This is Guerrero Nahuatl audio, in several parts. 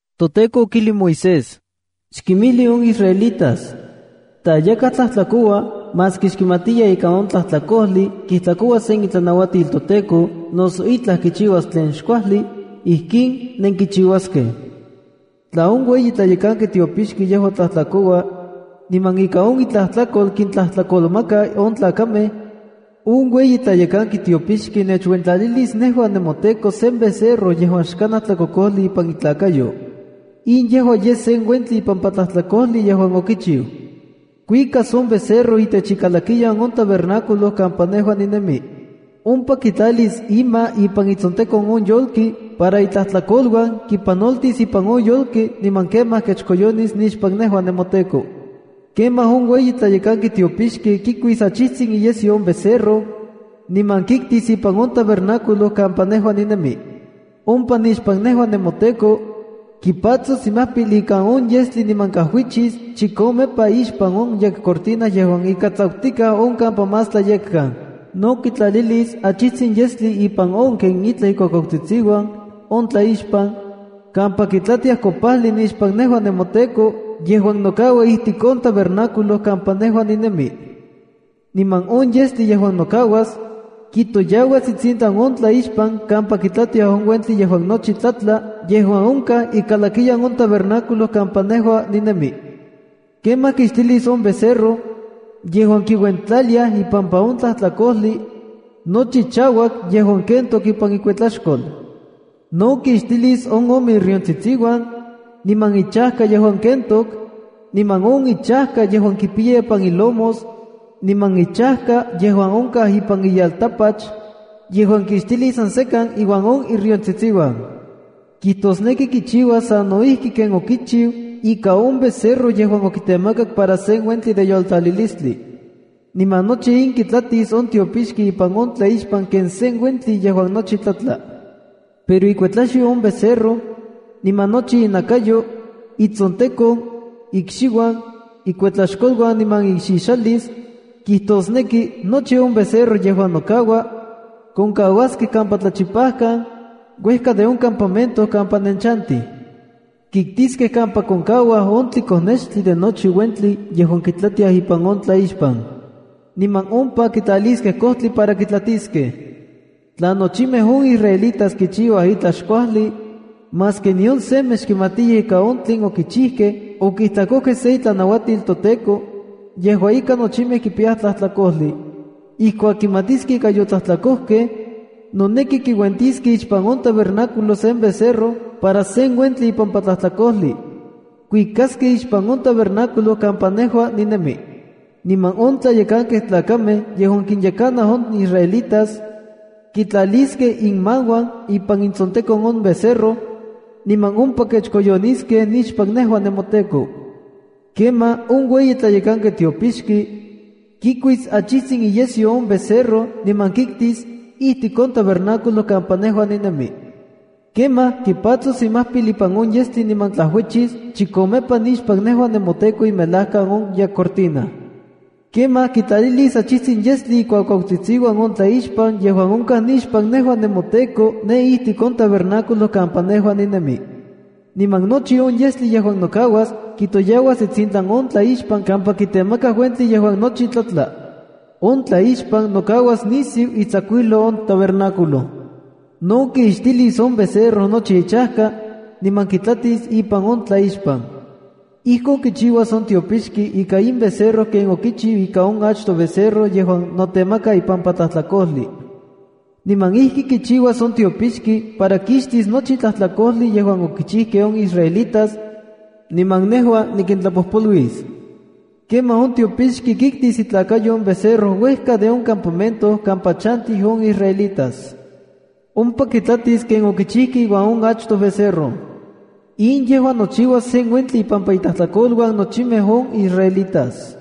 ToTEKO okijli Moisés: “Xkinmijli on israelitas: Tla yakaj tlajtlakoua, maski xkimatiya ika on tlajtlakojli kijtlakoua sen itlanauatil toTEKO, noso itlaj kichiuas tlen xkuajli, ijkin nenkichiuaskej: ’Tla on ueyi tlayekanki tiopixki yejua tlajtlakoua, niman ika on itlajtlakol kintlajtlakolmaka on tlakamej, on ueyi tlayekanki tiopixki nechuentlalilis nejua nemoTEKO sen becerro yejuan xkanaj tlakokojli ipan itlakayo. In yejua yes sen uentli ipampa tlajtlakojli yejuan okichiu. Kuikas on becerro itech ikalakiyan on tabernáculo kampa nejua ninemi. Ompa kitlalis ima ipan itsontekon on yolki para itlajtlakoluan kipanoltis ipan on yolki niman kemaj kechkoyonis nixpan nejua nemoTEKO. Kemaj on ueyi tlayekanki tiopixki kikuis achijtsin iyesyo on becerro, niman kiktis ipan on tabernáculo kampa nejua ninemi. Ompa nixpan nejua nemoTEKO, kipatsos imajpil ikan on yestli niman kajuichis chikomepa ixpan on yekcortina yejuan ika tsakutikaj on kampa Más Tlayekkan. No kitlatlalilis achijtsin yestli ipan on ken itlaj ikuakuakatsitsiuan on tlaixpan, kampa kitlatiaj kopajli nixpan nejua nemoTEKO, yejuan nokaua ijtik on tabernáculo kampa nejua ninemi. Niman on yestli yejuan nokauas, kitoyauas itsintlan on tlaixpan kampa kitlatiaj on uentli yejuan nochi tlatla yejuan onkaj ikalakiyan on tabernáculo kampa nejua ninemi. Kemaj kixtilis on becerro, yejuan kiuentlaliaj ipampa on tlajtlakojli, nochi chauak yejuan kentok ipan ikuetlaxkol. No kixtilis on ome iriontsitsiuan, niman ichajka yejuan kentok, niman on ichajka yejuan kipiya ipan ilomos, niman ichajka yejuan onkaj ipan iyeltapach, yejuan kixtilis san sekan iuan on iriontsitsiuan. Kijtosneki kichiuas sano ijki ken okichiu ika on becerro yejuan okitemakak para sen uentli de yoltlalilistli. Niman nochi in kitlatis on tiopixki ipan on tlaixpan ken sen uentli yejuan nochi tlatla. Pero ikuetlaxyo on becerro, niman nochi inakayo, itsontekon, ikxiuan, ikuetlaxkoluan niman ixixalis, kijtosneki, nochi on becerro yejuan nokaua, konkauaskej kampa tlachipajkan, uejka de on campamento kampa nenchantij. Kiktiskej kampa konkauaj on tlikonextli de nochi uentli yejuan kitlatiaj ipan on tlaixpan. Niman ompa kitlaliskej kojtli para kitlatiskej. ’Tla nochimej on israelitas kichiuaj itlaj xkuajli, maski nion semej xkimatiyaj ika on tlen okichijkej okijtlakojkej se itlanauatil toTEKO, yejua ika nochimej kipiyaj tlajtlakojli, Ijkuak kimatiskej ika yotlajtlakojkej, noneki kiuentiskej ixpan on tabernáculo sen becerro para sen uentli ipampa tlajtlakojli. Kuikaskej ixpan on tabernáculo kampa nejua ninemi, niman on tlayekankej tlakamej yejuan kinyekanaj on israelitas, kitlaliskej inmauan ipan itsontekon on becerro, niman ompa kechkoyoniskej nixpan nejua nemoTEKO. Kemaj on ueyi tlayekanki tiopixki, kikuis achijtsin iyesyo on becerro niman kiktis ijtik on tabernáculo kampa nejua ninemi. Kemaj kipatsos imajpil ipan on yestli niman tlajuichis chikomepa nixpan nejua nemoTEKO imelajkan on yekcortina. Kemaj kitlatlalilis achijtsin yestli on ken itlaj ikuakuautsitsiuan on tlaixpan yejuan onkaj nixpan nejua nemoTEKO ne ijtik on tabernáculo kampa nejua ninemi. Niman nochi on yestli yejuan nokauas kitoyauas itsintlan on tlaixpan kampa kitemakaj uentli yejuan tlatla. On tlaixpan nokaua nisiu itsakuijlou on tabernáculo. No kixtilis on becerro nochi ichajka, niman kitlatis ipan on tlaixpan. Ijkon kichiuas on tiopixki ika in becerro ken okichiu ika on achtoj becerro yejuan notemaka ipampa tlajtlakojli. Niman ijki kichiuas on tiopixki para kixtis nochi tlajtlakojli yejuan okichijkej on israelitas, niman nejua nikintlapojpoluis. Kemaj on tiopixki kiktis itlakayo on becerro uejka de on campamento kampa chantij on israelitas. Ompa kitlatis ken okichijkej iuan on achtoj becerro. In yejua nochiuas sen uentli ipampa intlajtlakoluan nochimej on israelitas.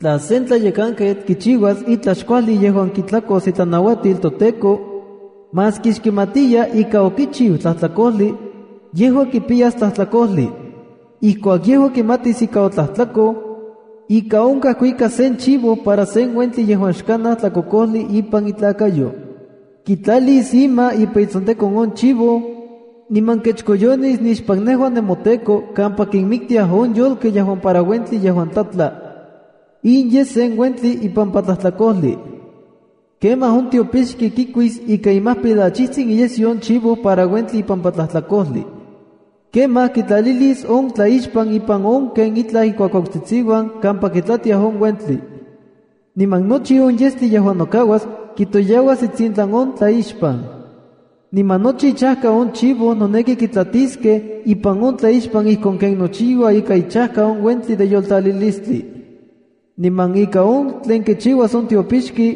’Tla sen tlayekanketl kichiuas itlaj xkuajli yejuan kijtlakos itlanauatil toTEKO, maski xkimatiya ika okichiu tlajtlakojli, yejua kipiyas tlajtlakojli. Ijkuak yejua kimatis ika otlajtlakoj, ika onkaj kuikas sen chivo para sen uentli yejuan xkanaj tlakokojli ipan itlakayo. Kitlalis ima ipan itsontekon on chivo, niman kechkoyonis nixpan nejua nemoTEKO kampa kinmiktiaj on yolkej yejuan para uentli yejuan tlatla. In yes sen uentli ipampa tlajtlakojli. Kemaj on tiopixki kikuis ika imajpil achijtsin iyesyo on chivo para uentli ipampa tlajtlakojli. Kemaj kitlalilis on tlaixpan ipan on ken itlaj ikuakuautsitsiuan kampa kitlatiaj on uentli. Niman nochi on yestli yejuan nokauas kitoyauas itsintlan on tlaixpan. Niman nochi ichajka on chivo noneki kitlatiskej ipan on tlaixpan ijkon ken nochiua ika ichajka on uentli de yoltlalilistli. Niman ika on tlen kichiuas on tiopixki,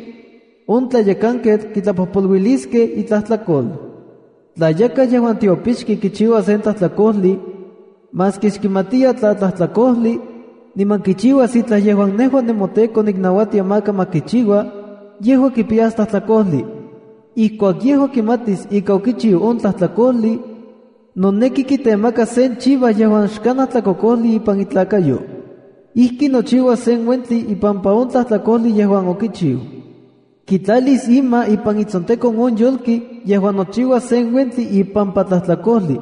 on tlayekanketl kitlapojpoluiskej itlajtlakol. ’Tla yakaj yejuan xtiopixki kichiua sen tlajtlakojli, maski xkimatiya tla tlajtlakojli, niman kichiuas itlaj yejuan nejua nemoTEKO niknauatia maka ma kichiua, yejua kipiyas tlajtlakojli. Ijkuak yejua kimatis ika okichiu on tlajtlakojli, noneki kitemakas sen chiva yejuan xkanaj tlakokojli ipan itlakayo. Ijki nochiuas sen uentli ipampa on tlajtlakojli yejuan okichiu. Kitlalis ima ipan itsontekon on yolki yejuan nochiuas sen uentli ipampa tlajtlakojli.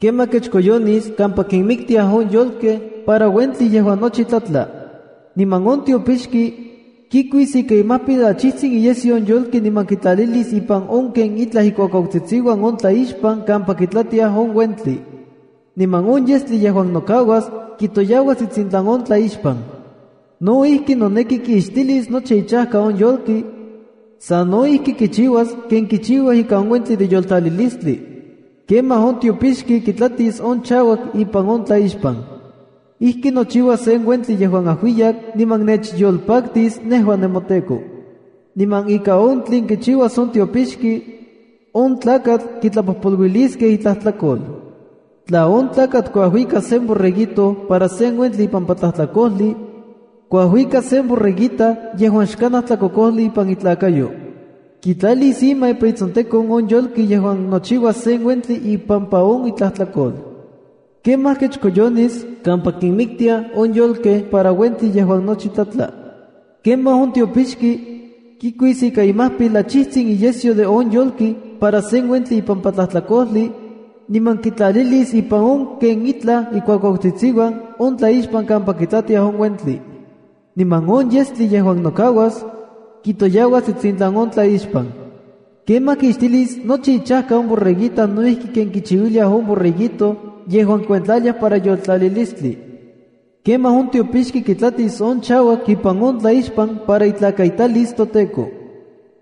Kemaj kechkoyonis kampa kinmiktiaj on yolkej para uentli yejuan nochi tlatla. Niman on tiopixki, kikuis ika imajpil achijtsin iyesyo on yolki niman kitlatlalilis ipan on ken itlaj ikuakuautsitsiuan on tlaixpan kampa kitlatiaj on uentli. Niman on yestli yejuan nokauas, kitoyauas itsintlan on tlaixpan. ’No ijki, noneki kixtilis nochi ichajka on yolki, sa no ijki kichiuas ken kichiuaj ika on uentli de yoltlalilistli. Kemaj on tiopixki kitlatis on chauak ipan on tlaixpan. Ijki nochiuas sen uentli yejuan ajuiyak niman nechyolpaktis nejua nemoTEKO. Niman ika on tlen kichiuas on tiopixki, on tlakatl kitlapojpoluiliskej itlajtlakol. ’Tla on tlakatl kuajuikas sen borreguito para sen uentli ipampa tlajtlakojli, kuajuikas sen borreguita yejuan xkanaj tlakokojli ipan itlakayo. Kitlalis ima ipan itsontekon on yolki yejuan nochiuas sen uentli ipampa on itlajtlakol. Kemaj kechkoyonis kampa kinmiktiaj on yolkej para uentli yejuan nochi tlatla. Kemaj on tiopixki, kikuis ika imajpil achijtsin iyesyo on yolki para sen uentli ipampa tlajtlakojli, niman kitlatlalilis ipan on ken itlaj ikuakuautsitsiuan on tlaixpan kampa kitlatiaj on uentli. Niman on yestli yejuan nokauas, kitoyauas itsintlan on tlaixpan. Kemaj kixtilis nochi ichajka on borreguita no ijki ken kichiuiliaj on borreguito yejuan kikuentlaliaj para yoltlalilistli. Kemaj on tiopixki kitlatis on chauak ipan on tlaixpan para itlakaitalis toTEKO.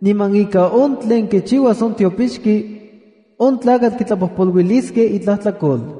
Niman ika on tlen kichiuas on tiopixki, on tlakatl kitlapojpoluiliskej itlajtlakol.